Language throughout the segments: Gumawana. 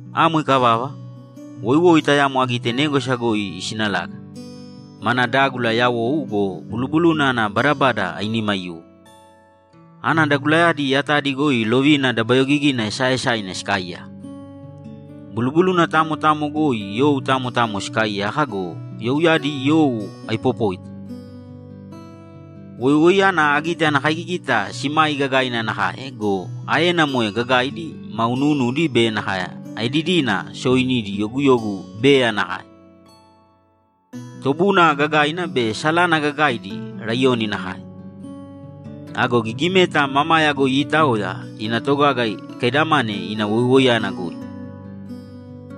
Amo ikavava, woiwoi tayamo agite négwasa goi isinalaga. Mana dágula yawou go, bulubuluna ana badabada ainima aiyuwo. Ana dagulayadi yatadi goi lovina dabayogigina esaaesaina sikaaiyaka. Bulubuluna tamo tamo goi you tamo tamo sikaaiyaka go, youyadi you aipopóita. Woiwoiyana agite ana kaigigita simai gagaina nakae go, aena moe gagaidi ma unuunudi be nakae aedidina sooinidi yoguyogu bea nakae. Tobuna gagaina be salana gagaidi laiyoni nakae. Ago gigimeta mamaya goi iitaoya ina togaga ikaidamane ina woiwoiyana goi.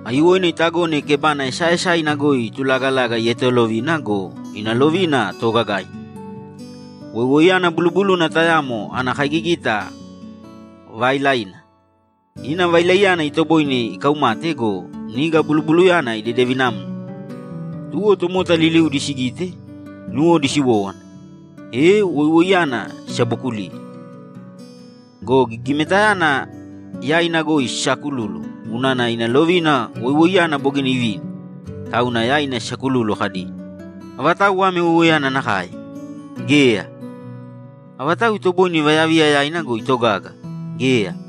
Aiyuwoina itagone kebana esaaesaina goi itulagalaga ietolovina be ina lovina toogagaina. Woiwoiyana bulubuluna tayamo ana kaigigita vaailaina. Ina vailaiyana itoboine ikaumate go, niga bulubulunayana idedevinamna. Tuwo tomota liliudi sigite, nuwodi siwówana, e woiwoiyana sisabokuliye. Go gigimetayana yaina goi sisaakululu unana ina lovina woiwoiyana bogina ivini, tauna yaina sisakululu kadi, ‘Avatau ame woiwoiyana nakae? Geya! Avatau itoboine ivayaviya yaina go, itogaga? Geya!’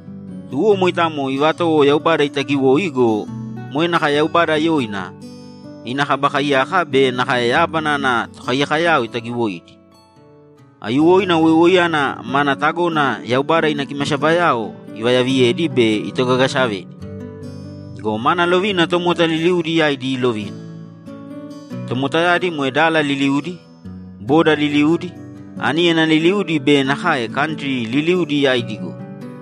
Tuwo moitamo ivatowo Yaubada itagiwoi go, moe nakae Yaubada yoina, ina Kaba Kaiyaka be nakae yábana ana tokaiyakoyao itagiwoidi. Aiyuwoina woiwoiyana mana tagona Yaubada ina kimasabayao ivayaviyedi be itogagasavedi. Go mana lovina tomota liliudi yaidi iilovina. Tomotayadi moe dala liliudi, boda liliudi, aníyana liliudi be nakae kantri liliudi yaidi goi.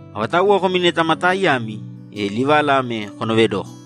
Avatauwa komi neta ma taaiyami, e livala ame konoovedōko: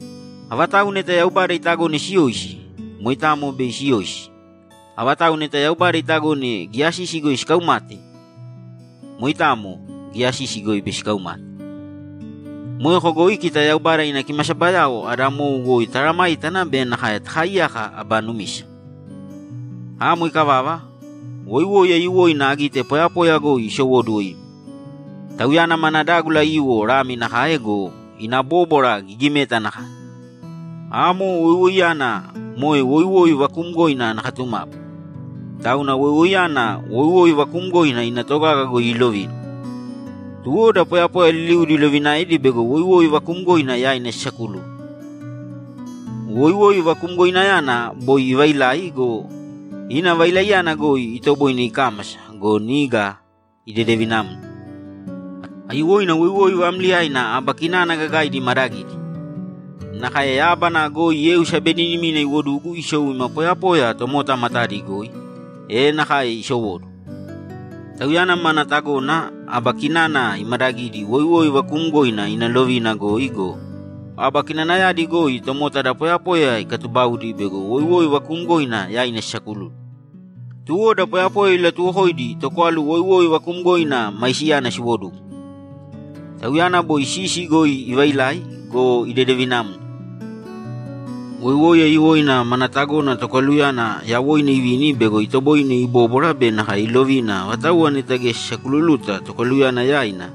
Avatau neta Yaubada itagone siyoisi, moitamo bei siyoisi. Avatau neta Yaubada itagone giya sisi goi sikaumate, moitamo giya sisi goi bei sikaumate. Moeko goi kita Yaubada ina kimasabayao ada mou goi taaramāitana be nakae takaaiyāka aba numisa. Amo ikavava, woiwoi aiyuwoina agite poyapoya goi isowóduwo ima. Tauyana mana dágula aiyuwo lami nakae go, ina bóbwara gigimeta nakae. Amo woiwoiyana moe woiwoi vakuumgoina ana katumapu. Tauna woiwoiyana woiwoi vakuumgoina ina togaga goi iilovina. Tuwo da poyapoya liliudi ilovinaedi bego woiwoi vakuumgoina yaina sisakululu. Woiwoi vakumgoinayana boi ivailai go, ina vailaiyana goi itoboine ikámasa go, niga idedevinamna. Aiyuwoina woiwoi vaamliyaina aba kinana gagaidi imaadagidi. Nakae yábana goi yeu sabeninimina iwodugu isou ima poyapoya tomota matadi goi, e nakae isowóduwo. Tauyana mana tagona aba kinana imadagidi woiwoi vakuumgoina ina lovina goi go, aba kinanayadi goi tomota da poyapoya ikatubaudi bego woiwoi vakuumgoina yaina sisakululu. Tuwo da poyapoya ilatuwokoidi tokwalu woiwoi vakuumgoina maisiyana siwodugu. Tauyana boi sisi goi ivailai go, idedevinamna. Woiwoi aiyuwoina mana tagona tokwaluyana yawoina ivini bego itoboine ibóbwara be nakae ilovina avatauwa neta geya sisakululuta tokwaluyana yaina,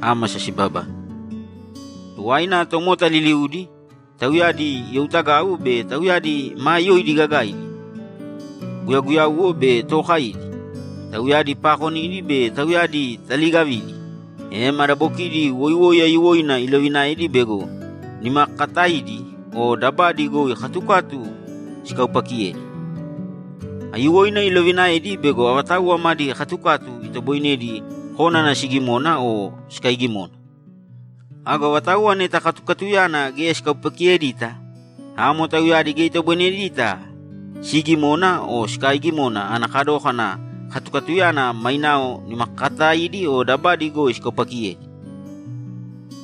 ámasa sibabane. Tuwaina tomota liliudi, tauyadi youtagau be tauyadi maa yoidi gagaidi, guyaguyauwo be tookaidi, tauyadi paakonidi be tauyadi taliigavidi, e madabokidi woiwoi aiyuwoina ilovinaedi bego nimakakataidi o dabadi goi katukatu sikaupakiyedi. Aiyuwoina ilovinaedi bego avatauwa madi katukatu itoboinedi kónana sigimona o sikaigimona. Ago avatauwa neta katukatuyana geya sikaupakiyedita, amo tauyadi geya itoboinedita siigimona o sikaaigimona ana kadókana katukatuyana mainao nimakakataidi o dabadi goi sikaupakiyedi.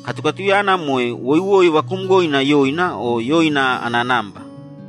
Katukatuyana moe woiwoi vakuumgoina yoina o yoina ana namba.